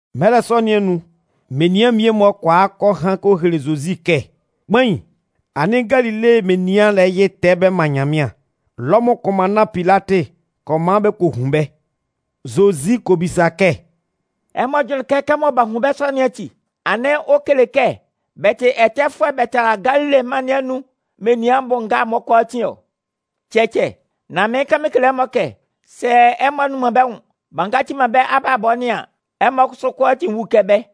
Mɛlɛ sɔ nɩn anun, menian mmie-mɔ kɔ a kɔ han kɔ hele Zozi kɛ: “Kpain, anɩn Galile menian lɛ yɩ tɛɛ bɛ man Nyanmɩan. Lɔmʋn kʋnmanna Pilatɩ kɔ man bɛ kɔ hun bɛ́.” Zozi kɔ bisa kɛ: “Ɛmɔ jʋnlɩn kɛ kɛmɔ b'a hun bɛ́ sɔ nɩn ati, anɩn ɔ kele kɛ bɛ tɩ ɛtɛfʋɛ bɛ tala Galile mân nɩn anun menian bʋ nga'n-mɔ kʋalaatin ɔ? Cɛcɛ. Nan mɩɩn kan mɩn kele ɛmɔ kɛ, sɛ ɛmɔ a nnun man bɛ́ nwʋn b'a ngaci man bɛ́ abalabɔ nɩn an, ɛmɔ kʋsʋ kʋalaatin 'wu kɛ bɛ́.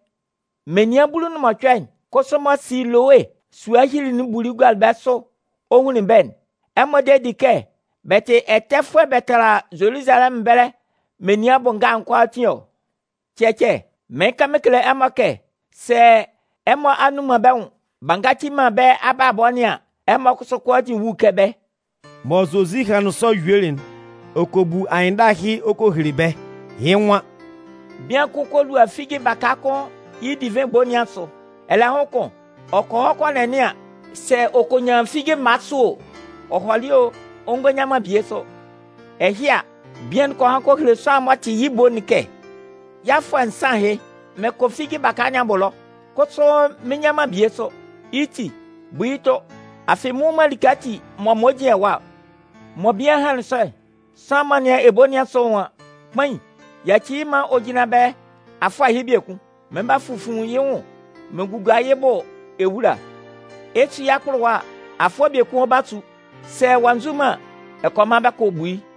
Menian bulu nʋn mɔcʋɛ'n kʋsʋ mɔ Silowe sua hyilili'n buli gualɩ bɛ́ sʋ ɔ hunlin bɛ́'n, ɛmɔ de di kɛ bɛ tɩ ɛtɛfʋɛ bɛ tala Zoluzalɛmʋn ɛbɛlɛ menian bʋ nga'n kʋalaatin ɔ? Cɛcɛ. Nan mɩɩn kan mɩn kele ɛmɔ kɛ, sɛ ɛmɔ a nnun man bɛ́ nwʋn b'a ngaci man bɛ́ abalabɔ nɩn an, ɛmɔ kʋsʋ kʋalaatin 'wu kɛ bɛ́.” Mɔ Zozi hanlɩn sɔ yuelɩ'n, ɔ kɔ bu anyɩnndala ɛhɩ ɔ kɔ hele bɛ́. Yɩ́ nwan: “Bian kʋn kɔ lua figi baka kʋn yɩ́ divɩn ebo nɩn asʋ. Ɛlɛhʋn kʋn, ɔ kɔ hɔ kɔ nɛnɩan sɛ ɔ kɔ nyan figi mma sʋ o. Ɔ hɔlɩ o, ɔ ngɔ nyan man bie sʋ. Ɛhɩ a, bian'n kɔ han kɔ hele sʋanlan'n m'ɔ tɩ yɩ́ ebo'n kɛ: ‘Yɩ́ afʋɛ nsan ahɩ. Mɩn kɔ figi baka nɩn abʋ ɛlɔ, kʋsʋ mɩn nnyan man bie sʋ. Yɩ́ ti, bu yɩ́ tʋ. Afɩ, mɩn nnwun man like ati m'ɔ man ɔ jin ɛwa ɔ.’ “Mɔ bian'n hanlɩn sɔ'n, sʋanlan'n m'ɔ nɩan ebo nɩn asʋ'n nwan: ‘Kpain, yaci yɩ́ maan ɔ jínlan ɛbɛlɛ afʋɛ ɛhɩ biekun. Mɩn 'ba fufun yɩ́ nwʋn mɩn gugua yɩ́ bʋ ewula. Ɛ 'su yɩ́ akpʋlʋwa a, afʋɛ biekun ɔ 'ba su. Sɛ ɔ'a nzu man an, ɛ kɔ man bɛ kɔ bu yɩ́.’”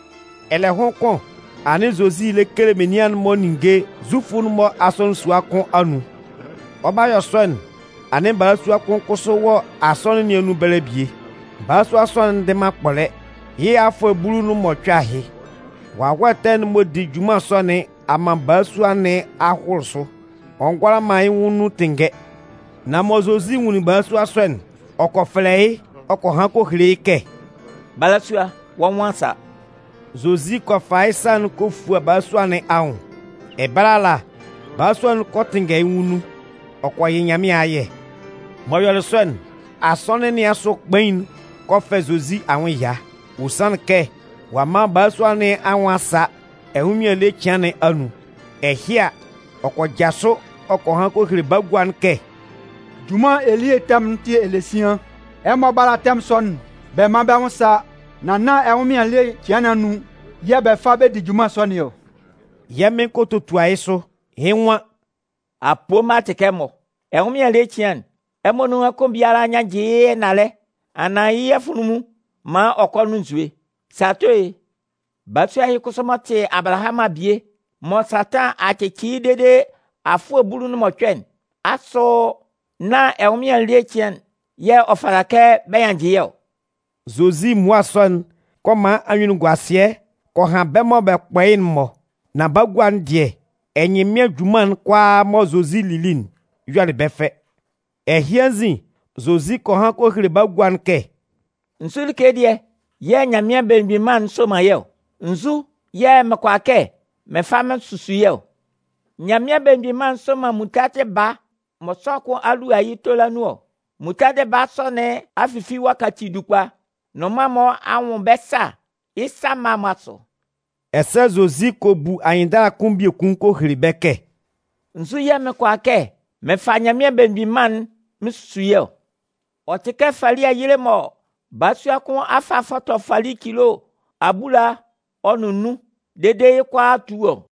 Ɛlɛhʋn kʋn, anɩn Zozi lɛ kele menian'n-mɔ ninnge Zufʋ'n-mɔ asɔnɩn sua kʋn anun. Ɔ 'ba yɔ sɔ'n, anɩn balasua kʋn kʋsʋ wɔ asɔnɩn sua nɩn anun ɛbɛlɛ bie. Balasua sɔ'n ndɩ man akpɔlɛ yɩ́ afʋɛ bulu ɔ nʋn mɔcʋɛ ahɩ. Wawɛ ɛtɛ'n m'ɔ di junman sɔ nɩn a man balasua nɩn a hʋlʋ sʋ. Ɔ ngʋala man yɩ́ nwʋn nun tɩnngɛ. Nan mɔ Zozi nwunlin balasua sɔ'n, ɔ kɔ fɛlɛ yɩ́ ɔ kɔ han kɔ hele yɩ́ kɛ: “Balasua, wɔ́ nwʋn a sa!” Zozi kɔ fa yɩ́ sa'n kɔ fua balasua nɩn anwʋn. Ɛbɛlɛ ala, balasua'n kɔ tɩnngɛ yɩ́ nwʋn nun, ɔ kɔ yɩ Nyanmɩan ayɛ. M'ɔ yɔlɩ sɔ'n, asɔnɩn sua nɩn asʋ kpain'n kɔ fɛ Zozi anwʋn ɛya. Ɔ sanlɩn kɛ ɔ'a man balasua nɩn anwʋn a sa ɛnwʋnmɩan ele cɩan nɩn anun. Ɛhɩ a, ɔ kɔ jasʋ ɔ kɔ han kɔ hele bagua'n kɛ: “Junman elie tɛmʋn'n tɩ elesian. Ɛmɔ bála tɛmʋn sɔ'n bɛ mán bɛ́ nwʋn sá. Nan nán ɛnwʋnmɩan ele cɩan nɩn anun yɛ̂ bɛ fa bɛ di junman sɔ nɩn ɔ!” Yɛ́ Mɩn kɔ totua yɩ́ sʋ, yɩ́ nwan: “Apoo mma tɩ kɛ ɛmɔ! ɛnwʋnmɩan ele cɩan'n, ɛmɔ nunhan kʋn biala nyannjɩ yɩ́ ɛnalɛ anaan yɩ́ afunlunmun'n maan ɔ kɔ nʋn nzue. Sɛ ato e? Balasua ɛhɩ kʋsʋ m'ɔ tɩ Abalahamʋn abie, mɔ Satan a cɩcɩ yɩ́ dede afʋɛ bulu nʋn mɔcʋɛ'n, asʋ nán ɛnwʋnmɩan ele cɩan yɛ̂ ɔ fata kɛ bɛ nyannjɩ yɩ́ ɔ?” Zozi mmua sɔ'n kɔ man anyunnunguasɩɛ kɔ han bɛ́ mɔ bɛ kpɔ yɩ́'n-mɔ. Nan bagua'n dɩɛ, ɛnyɩnmɩan junman'n kʋalaa mɔ Zozi lili'n yɔlɩ bɛ́ fɛ. Ɛhɩ anzin, Zozi kɔ han kɔ hele bagua'n kɛ: “Nzu like dɩɛ yɛ̂ Nyanmɩan Belemgbin Mân'n soman yɩ́ ɔ? Nzu yɛ̂ mɩn kʋala kɛ mɩn fa mɩn susu yɩ́ ɔ? Nyanmɩan Belemgbin Mân'n soman muntadɩ baa mɔ sʋanlan kʋn a lua yɩ́ tola nun ɔ. Muntadɩ baa sɔ nɩn a fifi ɔ a kaci dukpa. Nnʋnman'n-mɔ a nwʋn bɛ́ sâ yɩ́ sa mma'n-mɔ asʋ” Ɛsɛ Zozi kɔ bu anyɩnndala kʋn biekun kɔ hele bɛ́ kɛ: “Nzu yɛ̂ mɩn kʋala kɛ mɩn fa Nyanmɩan Belemgbin Mân'n mɩn susu yɩ́ ɔ? Ɔ tɩ kɛ fali ayile mɔ balasua kʋn a fa a fɔtɔ fali cilo abulaa ɔ nʋn nnun dede yɩ́ kʋalaa a tu ɔ.”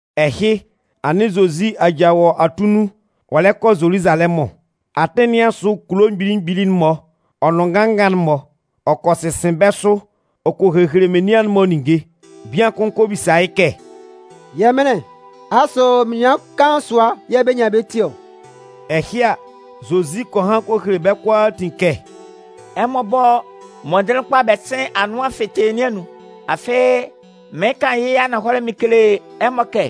Ɛhɩ, anɩn Zozi aja wɔ atunnun ɔ lɛ kɔ Zoluzalɛmʋn. Atɩn nɩn asʋ kulo mgbili mgbili'n-mɔ ɔ nʋn nganngan'n-mɔ, ɔ kɔ sɩsɩn bɛ́ sʋ ɔ kɔ hehele menian'n-mɔ ninnge. Bian kʋn kɔ bisa yɩ́ kɛ: “Yɛmɩnlɩn, asʋ menian kaan sʋa yɛ̂ bɛ 'nyan bɛ́ ti ɔ?” Ɛhɩ a, Zozi kɔ han kɔ hele bɛ́ kʋalaatin kɛ: “Ɛmɔ bɔ́ mɔndɩnlɩn kpa bɛ sɩ́n anʋan fɩtɩɩ nɩn anun. Afɩ, mɩɩn kan yɩ́ ananhɔlɛ mɩn kele ɛmɔ kɛ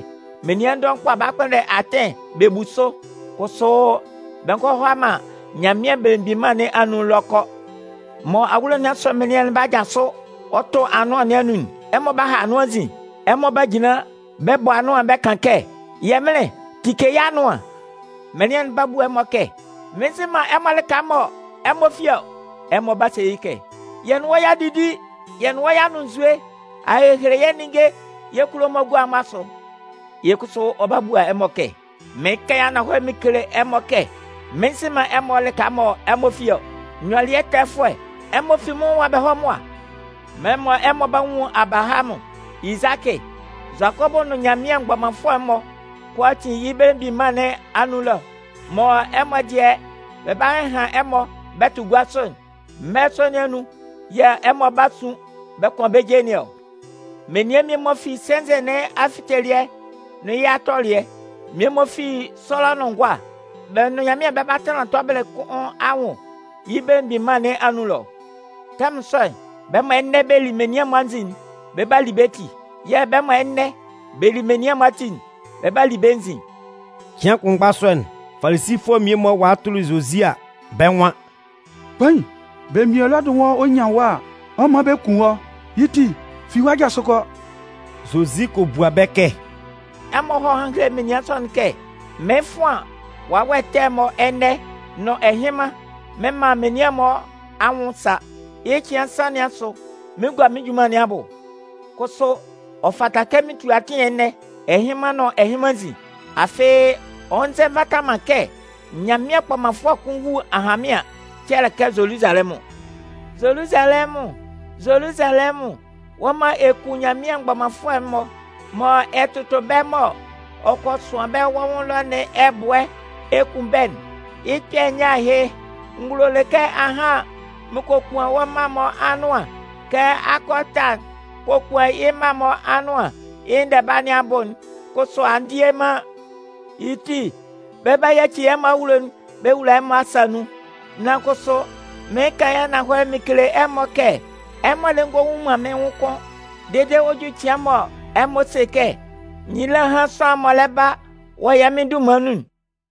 menian dɔʋn 'ba kpʋnndɛ atɩn bɛ bu sʋ, kʋsʋ bɛ ngɔ hʋala man Nyanmɩan Belemgbin Mân nɩn anun ɛlɔ kɔ. Mɔ awulo nɩn asʋ mɩnlɩan'n 'ba jasʋ ɔ tʋ anʋan nɩn anun'n, ɛmɔ 'ba ha anʋan nzin. Ɛmɔ 'ba jinlan bɛ bɔ anʋan'n bɛ kan kɛ: ‘Yɛmɩnlɩn, tike yɛ́ anʋan.’ “Mɩnlɩan'n 'ba bua ɛmɔ kɛ: ‘Mɩn nzɩ man ɛmɔ lɩka mɔ ɛmɔ fi ɔ.’ “Ɛmɔ 'ba se yɩ́ kɛ: ‘Yɛ́ nʋn wɔ́ y'a didi, yɛ́ nʋn wɔ́ y'a nʋn nzue, a hehele yɛ́ ninnge yɛ́ kulo'n-mɔ gua'n-mɔ asʋ.’ “Yɩ́ kʋsʋ ɔ 'ba bua ɛmɔ kɛ: ‘Mɩɩn kan yɩ́ ananhɔlɛ mɩn kele ɛmɔ kɛ mɩn nzɩ man ɛmɔ lɩka mɔ ɛmɔ fi ɔ. Nyɔlɩɛtɛfʋɛ, ɛmɔ fi mɩ́n nwʋn ɛwa bɛ hɔ́ mʋa!’ Mɛlɛ mɔ ɛmɔ 'ba nwun Abalahamʋn, Izakɩ, Zʋakɔbʋ nʋn Nyanmɩan mgbɔmanfʋɛ'n-mɔ kʋalaatin yɩ́ belemgbin mân nɩn anun ɛlɔ, mɔ ɛmɔ dɩɛ bɛ 'ba hɩhan ɛmɔ bɛ tʋ gua sʋ'n, mɛlɛ sɔ nɩn anun yɛ̂ ɛmɔ 'ba sun bɛ kʋan bɛ́ je nɩn ɔ! Menian mmie-mɔ fi sɛnzɛ nɩn afitelɩɛ nʋn yɩ́ atɔlɩɛ, mmie-mɔ fi sɔlɔ nʋn ngʋa, bɛ́ nʋn Nyanmɩan bɛ 'ba tanlan tɔbɩlɩ kʋn anwʋn yɩ́ belemgbin mân nɩn anun ɛlɔ. Tɛmʋn sɔ'n, bɛ́ mɔ ɛnɛ bɛ li menian'n-mɔ anzin'n, bɛ 'ba li bɛ́ ti. Yɛ̂ bɛ́ mɔ ɛnɛ bɛ li menian'n-mɔ ati'n, bɛ 'ba li bɛ́ nzin.” Cɩan kʋnmgba sɔ'n, Falisifʋɛ mmie-mɔ walɩ tʋlɩ Zozi a, bɛ́ nwan: “Kpain, belemgbin Elɔdɩ nwan ɔ nyan wɔ́ a, ɔ 'man bɛ kun wɔ́. Yɩ́ ti, fi ɛwa jasʋ kɔ.” Zozi kɔ bua bɛ́ kɛ: “Ɛmɔ hɔ́ hán héle aminsanɩn sɔ'n kɛ: ‘Mɩɩn fʋan wawɛ ɛtɛ'n-mɔ ɛnɛ nʋn ɛhɩnman mɩn man menian'n-mɔ anwʋn sa. Yɩ́ cɩan nsan nɩn asʋ, mɩn 'gua mɩ́n junman nɩn abʋ.’ Kʋsʋ, ɔ fata kɛ mɩn tu atɩn ɛnɛ, ɛhɩnman nʋn ɛhɩnman nzin. Afɩ, ɔ nzɛ nvata man kɛ Nyanmɩan kpɔmanfʋɛ kʋn wú ahanmɩan cɛlɛkɛ Zoluzalɛmʋn. “Zoluzalɛmʋn, Zoluzalɛmʋn, wɔ́ mɔ ɛ kun Nyanmɩan mgbɔmanfʋɛ'n-mɔ, mɔ ɛ tʋtʋ bɛ́ mɔ ɔ kɔ sʋan bɛ́ wɔ́ nwʋn ɛlɔ nɩn ɛbʋɛ ɛ kun bɛ́'n, yɩ́ kpɛ̂ nyɛ ahɩ! N gulolɩ kɛ ahan mɩn kokuan wɔ́ mma'n-mɔ anʋan kɛ akɔ ɛta'n kokuan yɩ́ mma'n-mɔ anʋan yɩ́ ndɛba nɩn abʋ'n. Kʋsʋ a ndie man. Yɩ́ ti, bɛ 'ba yaci ɛmɔ awulo'n bɛ wula ɛmɔ asa nun. Nan kʋsʋ, mɩɩn kan yɩ́ ananhɔlɛ mɩn kele ɛmɔ kɛ ɛmɔ lɛ ngɔ nwun man mɩ́n nwʋn kʋ́n dede ɔ 'ju cɩan mɔ ɛmɔ 'se kɛ: ‘Nyila hán sʋanlan'n m'ɔ lɛ ba wɔ yɛ́ Mɩn dunman nun!’”